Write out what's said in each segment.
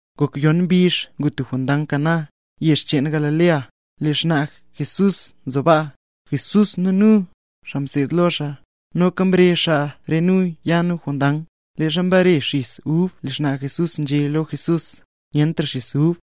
Ngok yon mbizh ngu tub jondang Caná, yezh cheen Galilea. Lee xnaa Jesús nzo baa; Jesús nu nu, xaa mseed lo xaa, noka mrezh xaa re nu ya nu jondang. Leezha mbare xis ub lee xnaa Jesús nzhé lo Jesús: —Nyentra xis ub.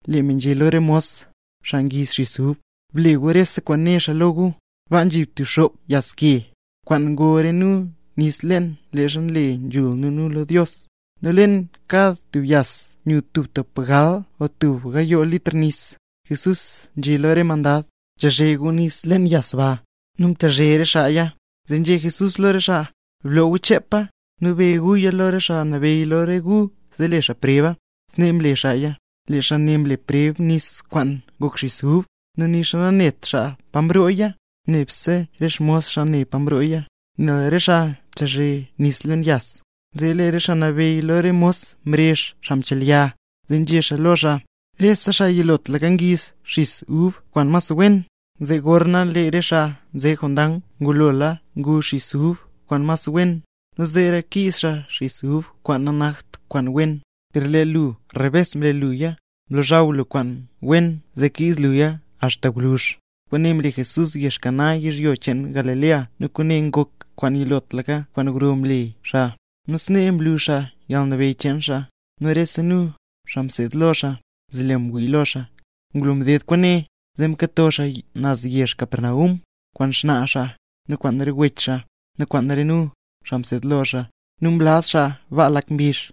Lee me nzhé lo re mos, xaa ngiiz xis ub: —Ble gu rese kwaan né xaa lo gu. Baa nzhi tub xop yas ke, kwaan ngo re nu nis leen leezha nle nzhul nu nu lo Dios. Nu leen kad tub yas nyu tub tapgal o tub gayoo litr nis. Jesús nzhé lo re mos: —Chezhe gu nis leen re yas ba. Nu mtezhe re xaaya. Zee nzhé Jesús lo re xaa: —Bloo gu chepa, nu be guya lo xaa nabeyy lo re gu zee le xaa preba. Snee mle xaaya. Lee xaa ne mle preb nis kwaan ngok xis ub, nu nixa nanet xaa pa mrooya; nebse re xmos xaa ne pa mrooya, nel re xaa mtezhe nis leen yas. Zee lee xaa nabeyy lo re mos mrezh xaa mchelya, zee nzhé xaa lo xaa: —Rese xaa yilotlaka ngiiz xis ub kwaan mas wen, zee gorna lee re xaa nze jondang ngulola ngu xis ub kwaan mas wen, nu zeera ngiiz xaa xis ub kwaan nanakt kwaan wen. ¡Per lee lu rebes mle luya, mlozhaw lu kwaan wen zee kiiz luya axta gwluzh! Kwaane mle Jesús yezh Caná yizhyo cheen Galilea nu kwaane ngoka kwaan yilotlaka kwaan gro kwaan mle xaa. Nu snee mlu xaa yalnabeyy cheen xaa, nu rese nu, xaa mseed lo xaa, mzelo ngwii lo xaa. Ngulo mded kwaane, zee mkato xaa naz yezh Capernaum, kwaan xnaa xaa, nu kwaan re wech xaa, nu kwaan re nu, xaa mseed lo xaa, nu mlaz xaa baa lak mbizh.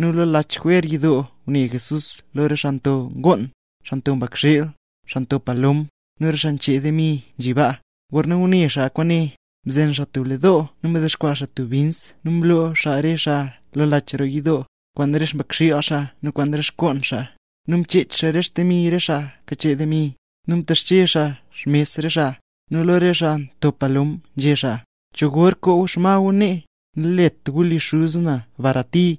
Nu lo lach jwer yidoo ngune Jesús lo re xaa nto ngoon, xaa nto mbakxiil, xaa nto palom, nu re xaa nchee demi nzhi baa. Gorna ngune xaa kwaane, mzen xaa tub le doo nu mdexkwaa xaa tub bins nu mloo xaa re xaa lo lach roo yidoo, kwaan re xmbakxiil xaa nu kwaan re xngoon xaa. Nu mchech xaa re xdemi re xaa kachee demi, nu mtexche xaa xmes re xaa. Nu lo re xaa nto palom, nzhé xaa: —¿Cho gor koo gu re xma gu nee? ¡Nalet gu li Xuz na barati!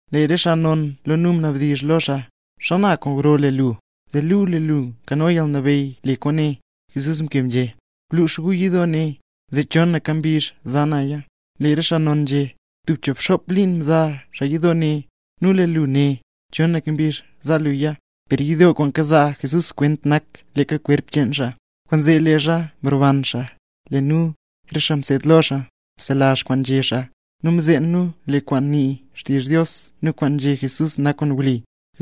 Lee re xaa non lo nu mnabdizh lo xaa: —¿Xana kwaan gro le lu, zee luu lee lu nkano yalnabeyy le kwaane? Jesús mkeb nzhé: —Blux gu yidoo ne, zee chonaka mbizh za naya. Lee re xaa non nzhé: —Tub choobxop liin mza xaa yidoo ne, nu lee lu né, chonaka mbizh za luya. Per yidoo kwaan kazaa Jesús kwent nak leeka kwerp cheen xaa. Kwaanzee leezha mroban xaa, lee nu, re xaa mseed lo xaa, mselazh kwaan nzhé xaa, nu mzeen nu lee kwaan nii xtizh Dios nu kwaan nzhé Jesús nak kwaan wli.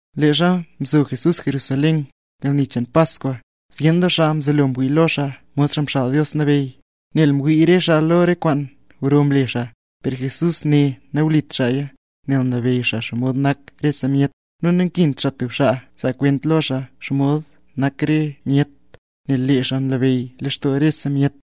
Leezha mzo Jesús Jerusalén, yalni cheen Paskwa, zyen doo xaa mzelo ngwii lo xaa mod Xaa Mxaal Dios Nabeyy, nel mwii re xaa lo re kwaan gro mle xaa. Per Jesús ne nawlit xaaya, nel nlabeyy xaa xomod nak rese myet. Nu nankint xaa tub xaa zaa kwent lo xaa xomod nak re myet, nel lee xaa nlabeyy lextoo rese myet.